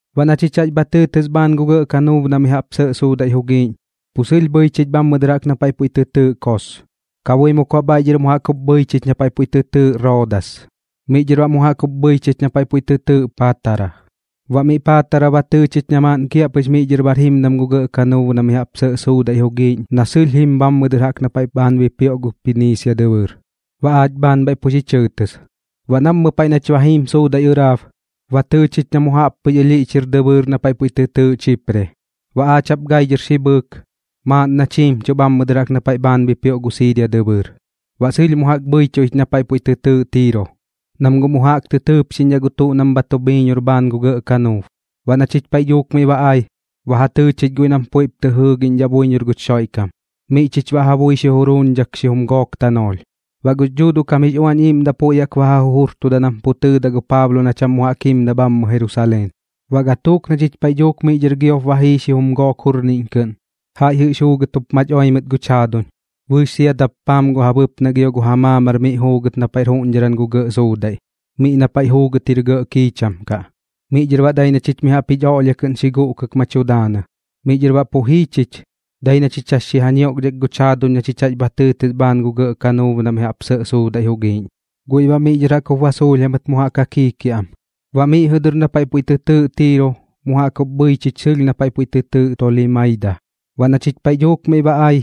Baꞌ na chich jax bha tɨɨtɨs bhaan gu gɇꞌ kanuub na mi jaꞌp sɇꞌ suudaiꞌ jugiiꞌñ, pu sɨlh bhɨi chich bhammɨ dɨr jaꞌk na paiꞌ puiꞌ tɨ tɨɨꞌ Kos. Kabuimuk baꞌ bhaiꞌ dhɨr mu jaꞌk jup bhɨi chich na paiꞌ puiꞌ tɨ tɨɨꞌ Roodas, miꞌ dhɨr baꞌ mu jaꞌk jup bhɨi chich na paiꞌ puiꞌ tɨ tɨɨꞌ Paatara. Baꞌ miꞌ Paatara ba tɨɨ chich na maaꞌn kiaꞌpɨx miꞌ dhɨr bar jimdam gu gɇꞌ kanuub na mi jaꞌp sɇꞌ suudaiꞌ jugiiꞌñ na sɨlh jim bhammɨ dɨr jaꞌk na paiꞌ bhaan bipioꞌ gu Piniisia dɨbɨɨr, baꞌ aach bhaan bhaiꞌ pu xi chɨɨtɨs. Baꞌ nammɨ paiꞌ nach ba jiim gu suudaiꞌ ɨraab, ba tɨɨ chich na mu jaꞌp pɨx alhiꞌch jir dɨbɨɨr na paiꞌ puiꞌ tɨ tɨɨꞌ Chipre. Baꞌ aach jaꞌp gai dhɨr xi bhɨɨk, maaꞌn nach jiimchuꞌ bhammɨ dɨr jaꞌk na paiꞌ bhaan bipioꞌ gu Siiria dɨbɨɨr. Baꞌ sɨlh mu jaꞌk bhɨichuꞌ ich na paiꞌ puiꞌ tɨ tɨɨꞌ Tiiro, nam guꞌ mu jaꞌk tɨ tɨɨpxidhaꞌ gu tuꞌ nam bha tu bhiiñor bhaan gu gɇꞌ kanuub. Baꞌ na chich paiꞌ dhuuk miꞌ ba ai, ba ja tɨɨ chich guiꞌ nam puiꞌp tɨ jɨɨgiꞌñdhaꞌ buiñor guch Xoiꞌkam, miꞌ chich baꞌ ja bui xi juruuñdhak xijum gook tanoolh. Baꞌ gux Dhuuduꞌ kam jix Uañ Iiꞌmdaꞌ puiꞌ jaꞌk ba ja jujurtuda nam pu tɨɨdaꞌ gu Paablo na cham mu jaꞌk jimdaꞌ bhammɨ Jerusaleen. Baꞌ gatuuk na chich paiꞌ dhuuk miꞌ dhɨr giop ba jii gu xijum gook jurniꞌñ kɨꞌn, jaiꞌ jɨꞌx juugɨt jup mach oi mɨt guch jaaduñ bɨɨx sia dappaam gu ja bɨpnaꞌ gio gu ja maamar miꞌ juugɨt na paiꞌr juꞌñdharan gu gɇꞌ suudaiꞌ, miꞌ na paiꞌ juugɨt jir gɇꞌ kiicham kaꞌ. Miꞌ dhɨr baꞌ dai na chich mi jaꞌp jich oꞌlhia kɨꞌn xi guꞌkɨk ma tu daanɨ. Miꞌ dhɨr baꞌ pu jii chich, dai na chich jax xi ja ñioꞌkdhak guch jaaduñ na chich jax bha tɨɨtɨs bhaan gu gɇꞌ kanuub na mi jaꞌp sɇꞌ suudaiꞌ jugiiꞌñ. Guiꞌ baꞌ miꞌ dhɨr jaꞌk jup ba suulh jamɨt mu jaꞌk ja kiikiaꞌam. Baꞌ miꞌ jɨꞌ dɨr na paiꞌ puiꞌ tɨ tɨɨꞌ Tiiro mu jaꞌk jup bhɨi chich sɨlh na paiꞌ puiꞌ tɨ tɨɨꞌ Tolimaida. Baꞌ na chich paiꞌ dhuuk miꞌ ba ai,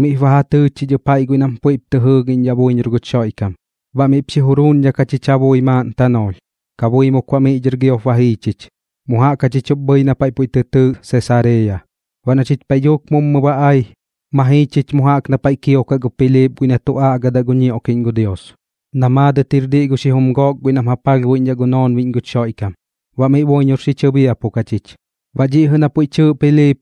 miꞌp ba ja tɨɨ chich ɨp jaiꞌ guiꞌ nam puiꞌp tɨ jɨɨgiꞌñdhaꞌ buiñor guch Xoiꞌkam, baꞌ miꞌp xi juruuñdhak jachich ja bui maaꞌn tanoolh. Kabuimuk baꞌ miꞌ dhɨr giop ba jii chich, mu jaꞌk jachich jup bhɨi na paiꞌ puiꞌ tɨ tɨɨꞌ Sesareeya. Baꞌ na chich paiꞌ dhuuk mummɨ ba ai, ma jii chich mu jaꞌk na paiꞌ kiokaꞌ gu Piliip guiꞌ na tu aꞌgadaꞌ gu ñioꞌkiꞌñ gu Dios, na maadɨt jir diꞌ gu xijum gook guiꞌ nam ja palhbuiꞌñdhaꞌ gu noonbiꞌñ guch Xoiꞌkam. Baꞌ miꞌ buiñor xi chɨbiapuk jachich. Baꞌ dhiꞌ jɨꞌ na puiꞌ tɨɨꞌ Piliip,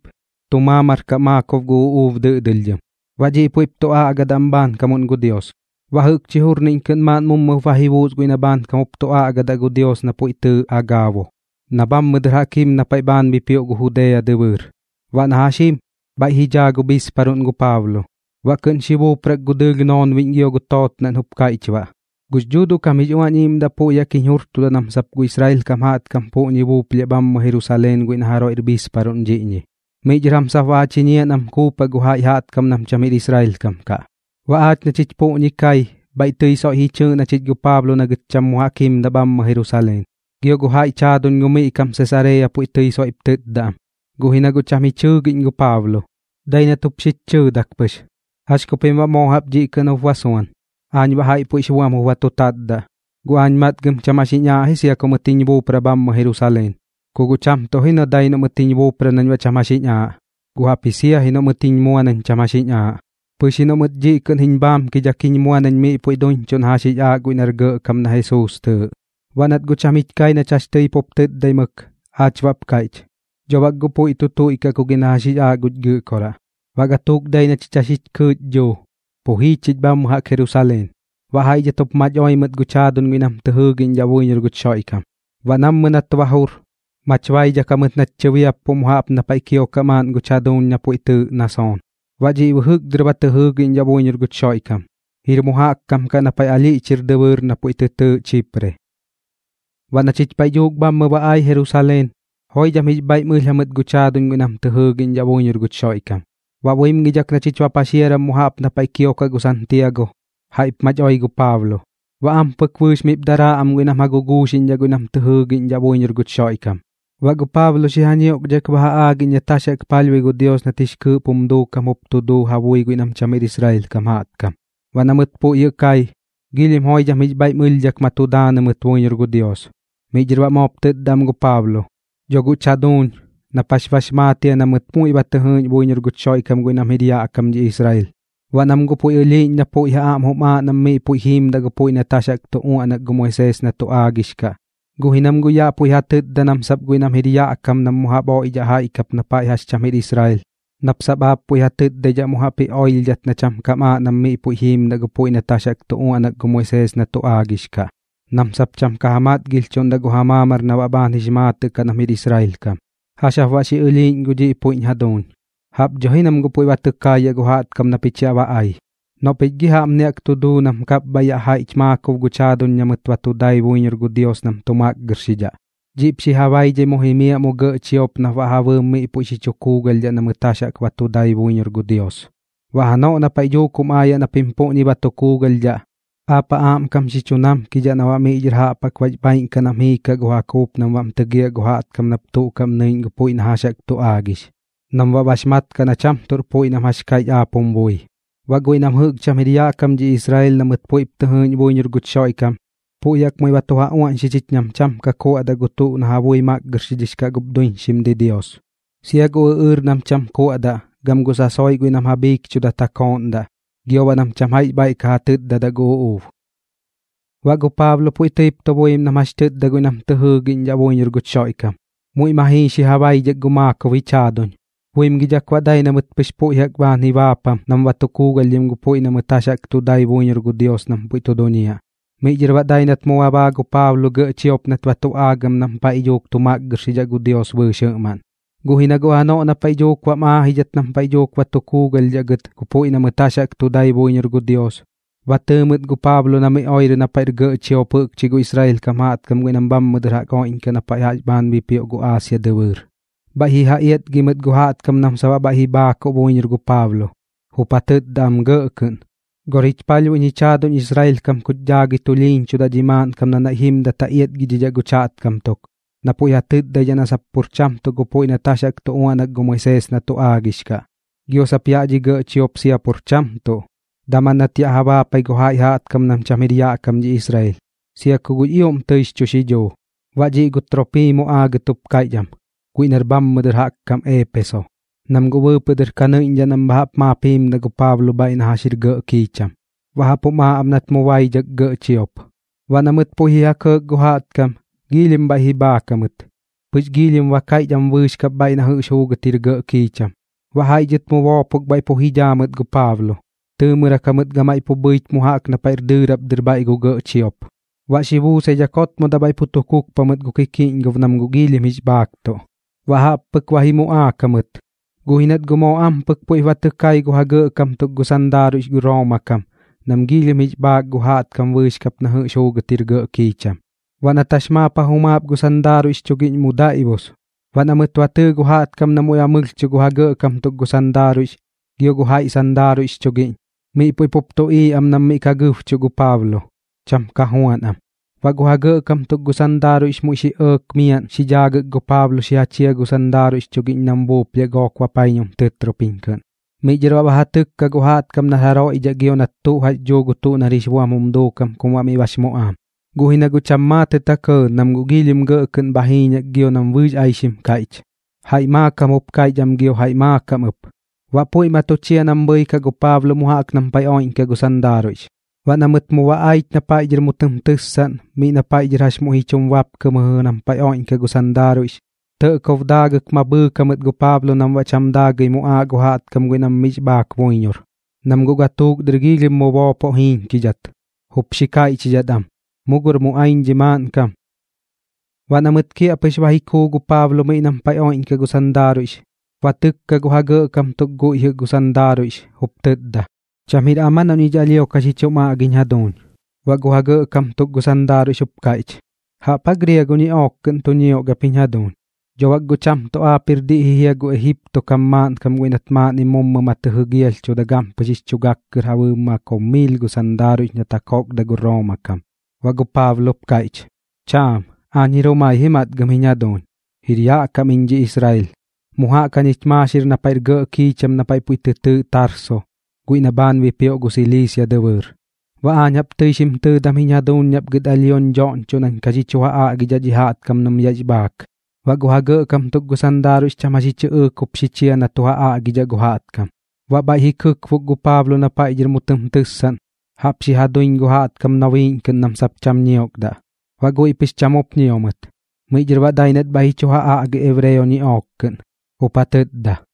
tu maamar kaꞌ maakob gu uꞌuub dɨꞌdɨlhdhɨm, baꞌ dhiꞌ puiꞌp tu aꞌgadaꞌ am bhaankamuꞌn gu Dios. Baꞌ jɨꞌkchi jurniꞌñ kɨꞌn maaꞌn mummɨp ba ji buus guiꞌ na bhaankam jup tu aꞌgadaꞌ gu Dios na puiꞌ tɨɨꞌ Agaabo, na bhammɨ dɨr jaꞌk jim na paiꞌ bhaan bipioꞌ gu Judea dɨbɨɨr. Baꞌ na jax jim, bhaiꞌ ji dhaa gu bhiisparuꞌn gu Paablo, baꞌ kɨꞌn xi buuprak gu dɨɨlh noonbiꞌñ gio gu tootnaꞌn jup kaiꞌch baꞌ: ―Gux Dhuuduꞌ kam jix Uañ Iiꞌmdaꞌ puiꞌ jaꞌk jiñ jurtuda nam sap gu Israel kam jaꞌtkam puꞌñi buuplhiaꞌ bhammɨ Jerusaleen guiꞌ na jaroiꞌr bhiisparuꞌn dhiꞌñi. Miꞌ dhɨr jam sap baꞌ ja chiñiaꞌ nam kuupaꞌ gu jaiꞌ jaꞌtkam nam cham jir Israel kam kaꞌ. Baꞌ aach na chich puꞌñi kai, bhaiꞌ tɨi soiꞌ ji chɨɨꞌn gu Paablo na gɨt cham mu jaꞌk jimdaꞌ bhammɨ Jerusaleen, gio gu jaiꞌch jaaduñ gu miꞌ kam Sesareeya puiꞌ tɨi soiꞌp tɨtda am. Guꞌ ji na guꞌ cham jich jɨɨgiꞌñ gu Paablo, dai nat jup xich chɨɨdak pɨx: ―¿Jax ku pim baꞌ moo jaꞌp dhiꞌ kɨꞌn jup ba suan? Aañ baꞌ jaiꞌ puiꞌx buam jup ba tu tatdaꞌ, guꞌ aañ matgɨm cham jax jiñ aaꞌ ji sia ku mɨt jiñ buupra bhammɨ Jerusaleen. Ku guꞌ cham tuꞌ ji dai noꞌ mɨt jiñ buupra nañ baꞌ cham jax jiñ aaꞌ, guꞌ jaꞌpji sia ji noꞌ mɨt jiñ mua nañ cham jax jiñ aaꞌ, pɨx ji noꞌ mɨt dhɨꞌ kɨꞌn jiñ bhaamkidhak jiñ mua nañ miꞌ puiꞌ duiñchuꞌ na jax jix aaꞌ guiꞌ nar Gɇꞌkam na Jesuus tɨɨꞌ. Baꞌ nat guꞌ cham jich kai nach jax tɨi pup tɨtdaimɨk, aach baꞌp kaiꞌch: ―Dho bak guꞌ puiꞌ tu tuiꞌkaꞌ ku gi na jax jix aaꞌ guch Gɨꞌkoraꞌ. Baꞌ gatuuk dai na chich jax jix kɨɨꞌch dhuu, pu jii chich bhammɨ jaꞌk Jerusaleen. Baꞌ jaiꞌ dhɨt jup mach oi mɨt guch jaaduñ guiꞌ nam tɨ jɨɨgiꞌñdhaꞌ buiñor guch Xoiꞌkam. Baꞌ nammɨ nat ba jur, mach baidhak jamɨt nach tɨbiappuꞌ mu jaꞌp na paiꞌ kiokaꞌ maaꞌn guch jaduuñ na puiꞌ tɨɨꞌ Nasoon. Baꞌ dhiꞌ bɨjɨk dɨr ba tɨ jɨɨgiꞌñdhaꞌ buiñor guch Xoiꞌkam, jir mu jaꞌk kam kaꞌ na paiꞌ alhiꞌch jir dɨbɨɨr na puiꞌ tɨ tɨɨꞌ Chipre. Baꞌ na chich paiꞌ dhuuk bhammɨ ba ai Jerusaleen, joidham jix bhaiꞌm ɨlh jamɨt guch jaaduñ guiꞌ nam tɨ jɨɨgiꞌñdhaꞌ buiñor guch Xoiꞌkam. Baꞌ buimgidhak na chich ba paxiaram mu jaꞌp na paiꞌ kiokaꞌ gu Santiago, jaiꞌp mach oi gu Paablo. Baꞌ ampɨk bɨɨx miꞌp daraa am guiꞌ nam ja guguuxiꞌñdhaꞌ guiꞌ nam tɨ jɨɨgiꞌñdhaꞌ buiñor guch Xoiꞌkam. Baꞌ gu Paablo xi ja ñioꞌkdhak ba ja aagiꞌñ nat jax jaꞌk palhbui gu Dios nat jix kɨɨꞌp jum duukam jup tu duu ja bui guiꞌ nam cham jir Israel kam jaꞌtkam. Baꞌ na mɨt puiꞌ jɨꞌ kai, joidham jix bhaiꞌm ɨlhdhak ma tu daanɨ mɨt buiñor gu Dios. Miꞌ dhɨr baꞌ moop tɨtda am gu Paablo: ―Dho guꞌch jaduuñ, nap jax bax maat jia na mɨt muiꞌ ba tɨ jɨɨꞌñ buiñor guch Xoiꞌkam guiꞌ nam jir yaꞌ kam dhi Israel, baꞌ nam guꞌ puiꞌ ɨlhiiꞌñ na pui ja aꞌm jum aaꞌ nam miꞌ puiꞌ jiimdaꞌ gu puiꞌ nat jax jaꞌk tu uaꞌnak gu Moisees na tu aagix kaꞌ. Guꞌ ji nam guꞌ yaꞌ puiꞌ ja tɨtda na sap guiꞌ nam jir yaꞌ kam nam mu jaꞌp oiꞌdhaꞌ jaiꞌ kap na paiꞌ jax cham jir Israel, nap sap aap puiꞌ ja tɨtdaidhaꞌ mu jaꞌp ji oilhidhat na cham kam aaꞌ nam miꞌ puiꞌ jiimdaꞌ gu puiꞌ nat jax jaꞌk tu uaꞌnak gu Moisees na tu aagix kaꞌ, nam sap cham ka ja matgilhchudidhaꞌ gu ja maamar na baꞌ bhaan jix maatɨꞌ kaꞌ nam jir Israel kam kaꞌ. ¿Jax jap baꞌ xi ɨlhiiꞌñ gu dhiꞌ puiꞌch jaduuñ? Jaꞌp dho ji nam guꞌ puiꞌ ba tɨ kaayaꞌ gu jaꞌtkam na pich yaꞌ ba ai. Noꞌ pich gi jaꞌpni jaꞌk tu duu nam kapbhaiꞌ yaꞌ jaiꞌch maakob guch jaaduñ na mɨt ba tu dai buiñor gu Dios nam tu makgɨrxidhaꞌ. Dhiꞌp xi ja baidhai mu jimiaꞌ mu gɇꞌ chiop nap baꞌ ja bɨɨm miꞌ puiꞌ xi chu kuugalhdhaꞌ na mɨt jax jaꞌk ba tu dai buiñor gu Dios. Baꞌ janoꞌ na paiꞌ dhuuk jum aayaꞌ na pim puꞌñi ba tu kuugalhdhaꞌ, aap ja aꞌmkam xi chu namkidhaꞌ na baꞌ miꞌ dhɨr jaꞌp jaꞌk bax bhaaiꞌn kaꞌ nam jiikaꞌ gu ja kuup nam baꞌm tɨgiaꞌ gu jaꞌtkam nap tuꞌ kaꞌm nɨiꞌñ gu puiꞌ na jax jaꞌk tu aagix, nam baꞌ bax mat kaꞌ na cham tuꞌr puiꞌ nam jax kaiꞌch aap jum bui. Baꞌ guiꞌ nam jɨꞌk cham jir yaꞌ kam dhi Israel na mɨt puiꞌp tɨ jɨɨꞌñ buiñor guch Xoiꞌkam, puiꞌ jaꞌk muiꞌ ba tu ja uaꞌñxi chich nam cham ka tu kuaꞌdaꞌ gu tuꞌ na ja bui makgɨrxix kaꞌ gup duiñxim didios, sia gu ɨꞌɨɨr nam cham kuaꞌdaꞌ gam gu sasoiꞌ guiꞌ nam ja bhiikchudat ja kooꞌndaꞌ, gio baꞌ nam cham jaiꞌx bhaiꞌ ka ja tɨtdadaꞌ gu uꞌuub. Baꞌ gu Paablo puiꞌ tɨip tu buim nam jax tɨtda guiꞌ nam tɨ jɨɨgiꞌñdhaꞌ buiñor guch Xoiꞌkam. Muiꞌ ma jii xi ja baidhak gu maakob jich jaaduñ, buimgidhak baꞌ dai na mɨt pɨx puiꞌ jaꞌk bhaan ji baapam nam ba tu kuugalhdhim gu puiꞌ na mɨt jax jaꞌk tu dai buiñor gu Dios nam pu tu duñiaꞌ. Miꞌ dhɨr baꞌ dai nat mu ba baa gu Paablo gɇꞌ chiop nat ba tu aagam nam paiꞌ dhuuk tu makgɨrxidhaꞌ gu Dios bɨɨx jɨꞌmaꞌn. Guꞌ ji na guꞌ janoꞌ na paiꞌ dhuuk bam aajidhat nam paiꞌ dhuuk ba tu kuugalhdhaꞌ gɨt gu puiꞌ na mɨt jax jaꞌk tu dai buiñor gu Dios, ba tɨɨ mɨt gu Paablo na miꞌ oirɨ na paiꞌr gɇꞌ chiop jɨꞌkchi gu Israel kam jaꞌtkam guiꞌ nam bhammɨ dɨr jaꞌp oiꞌñkaꞌ na paiꞌ jax bhaan bipioꞌ gu Aasia dɨbɨɨr. Bhaiꞌ ji ja iatgi mɨt gu jaꞌtkam nam sap baꞌ bhaiꞌ ji bhaakuꞌ buiñor gu Paablo, jup ja tɨtda am gɇꞌ kɨꞌn: ―Gor jich palhbuiꞌñ jich jaaduñ Israel kam kuch daagɨi tulhiiñchudaꞌ dhi maaꞌnkam na naiꞌ jimdat ja iatgidhidhaꞌ guch jaꞌtkam tuk, na puiꞌ ja tɨtdaidhaꞌ na sap pur cham tuꞌ gu puiꞌ nat jax jaꞌk tu uaꞌnak gu Moisees na tu aagix kaꞌ, gio sap yaꞌ dhi gɇꞌ chiop sia pur cham tuꞌ. Daman nat yaꞌ ja baapai gu jaiꞌ jaꞌtkam nam cham jir yaꞌ kam dhi Israel, sia ku guꞌx ioꞌm tɨix chu xidhuu. Baꞌ dhiꞌ gu Troopimo aagɨt jup kaiꞌch am, guiꞌ nar bhammɨ dɨr jaꞌk kam Eepeso, nam guꞌ bɨɨpɨꞌ dɨr ka nɨiꞌñ nam bha jaꞌp maap ka jim gu Paablo na paiꞌ jax jir gɇꞌ kiicham, baꞌ jaꞌp jum aaꞌ am nat mu baidhak gɇꞌ chiop. Baꞌ na mɨt puiꞌ ji ja kɇɇk gu jaꞌtkam, giilhim bhaiꞌ ji bhaak jamɨt, pɨx giilhim ba kaiꞌch am bɨɨx kap bhaiꞌ na jɨꞌx juugɨt jir gɇꞌ kiicham. Baꞌ jaiꞌ dhɨt mu boopok bhaiꞌ pu ji dhaa mɨt gu Paablo, tɨɨmɨrak jamɨt gamaiꞌ pu bhɨich mu jaꞌk na paiꞌr dɨɨrap dɨr bhaiꞌ gu gɇꞌ chiop, baꞌ xi buusaidhak jotmodaꞌ bhaiꞌ pu tu kukpa mɨt gu kikiꞌñgob nam guꞌ giilhim jix bhaaktuꞌ. Baꞌ jaꞌp pɨk ba ji muꞌaak jamɨt, guꞌ ji nat guꞌ moo ampɨk puiꞌp ba tɨ kai gu ja gɇꞌkam tuk gu sandaaruiꞌx gu Rooma kam nam giilhim jix bhaak gu jaꞌtkam bɨɨx kap na jɨꞌx juugɨt jir gɇꞌ kiicham. Baꞌ nat jax maap ja jumaap gu sandaaruiꞌx chugiꞌñ mu daiꞌbus. Baꞌ na mɨt ba tɨɨ gu jaꞌtkam na muiꞌ ba mɨlhchuꞌ gu ja gɇꞌkam tuk gu sandaaruiꞌx gio gu jaiꞌ sandaaruiꞌx chugiꞌñ, miꞌ puiꞌ pup tuꞌiiꞌ am nam miꞌ ka gɨbchuꞌ gu Paablo, cham ka juan am. Baꞌ gu ja gɇꞌkam tuk gu sandaaruiꞌx muiꞌ xi ɇɇk miaꞌn xi dhaagɨk gu Paablo xi ja chia gu sandaaruiꞌx chugiꞌñ nam buuplhiaꞌ gook bapaiñum tɨtropiñ kɨꞌn. Miꞌ dhɨr baꞌ ba ja tɨkka gu jaꞌtkam nar jaroiꞌ dhaꞌ gio nat tuꞌ jax dhuu gu tuꞌ nar jix buam jum duukam kum baꞌ miꞌ bax muꞌaam. Guꞌ ji na guꞌ cham maatɨt ja kɇɇ, nam guꞌ giilhim gɇꞌ kɨꞌn bha jiiñak gio nam bɨɨx aixim kaiꞌch, jaiꞌ maakam jup kaiꞌch am gio jaiꞌ maakam ɨp. Baꞌ puiꞌ ma tu chia nam bhɨikaꞌ gu Paablo mu jaꞌk nam paiꞌ oiꞌñkaꞌ gu sandaaruiꞌx. Baꞌ na mɨt mu ba aich na paiꞌ dhɨr mu tɨm tɨssaꞌn miꞌ na paiꞌ dhɨr jax muiꞌ ji chum bapkɨ mɨjɨꞌ nam paiꞌ oiꞌñkaꞌ gu sandaaruiꞌx, tɇꞌkob daagɨk ma bhɨɨk jamɨt gu Paablo nam baꞌ cham daagɨi muꞌaaꞌ gu jaꞌtkam guiꞌ nam miꞌx bhaak buiñor, nam guꞌ gatuuk dɨr giilhim mu boopoꞌ jiiñkidhat, jup xi kaiꞌchidhat am: ―¡Mu gor muꞌaiñ dhi maaꞌnkam! Baꞌ na mɨt kiaꞌpɨx ba ji kuu gu Paablo miꞌ nam paiꞌ oiꞌñkaꞌ gu sandaaruiꞌx, ba tɨkka gu ja gɇꞌkam tuk guiꞌ jɨꞌ gu sandaaruiꞌx, jup tɨtda: ―¿Cham jir am aa noꞌ ñich alhio ka xi chum aꞌgiñ jaduuñ? Baꞌ gu ja gɇꞌkam tuk gu sandaaruiꞌx jup kaiꞌch: ―¿Jaꞌp aa griago ñiꞌook kɨꞌn tu ñiok ap jiñ jaaduñ? ¿Dho bak guꞌ cham tuꞌ aap jir diꞌ ji jia gu Ejipto kam maaꞌnkam guiꞌ nat maaꞌnnim mummɨ ma tɨ jɨgialhchuda gampɨx jix chu gak kɨr ja bɨɨm maakob miil gu sandaaruiꞌx nat ja kokda gu Rooma kam? Baꞌ gu Paablo jup kaiꞌch: ―Cham, aañ jir jumai ji matgɨm jiñ jaduuñ. Jir yaꞌ kam iñ dhi Israel, mu jaꞌk jañich maaxir na paiꞌr gɇꞌ kiicham na paiꞌ puiꞌ tɨ tɨɨꞌ Tarso guiꞌ na bhaan bipioꞌ gu Siliisia dɨbɨɨr. Baꞌ aañ jaꞌp tɨi xim tɨɨdam jiñ jaduuñ nap gɨt alhioñ dhoꞌñchoꞌ nañ ka xi chu ja aꞌgidhaꞌ dhi jaꞌtkam nam yaꞌx bhaak. Baꞌ gu ja gɇꞌkam tuk gu sandaaruiꞌx cham jax ji chɨꞌɨɨk jup xi chia na tu ja aꞌgidhaꞌ gu jaꞌtkam. Baꞌ bhaiꞌ xi kɨkbok gu Paablo na paiꞌ dhɨr mu tɨm tɨssaꞌn, jaꞌp xi ja duiñ gu jaꞌtkam nobiiꞌñ kɨꞌn nam sap cham ñiokdaꞌ, baꞌ guiꞌ pɨx cham jup ñio mɨt. Miꞌ dhɨr baꞌ dai nat bhaiꞌ ji chu ja aꞌgi ebreo ñiꞌook kɨꞌn, jup ja tɨtda: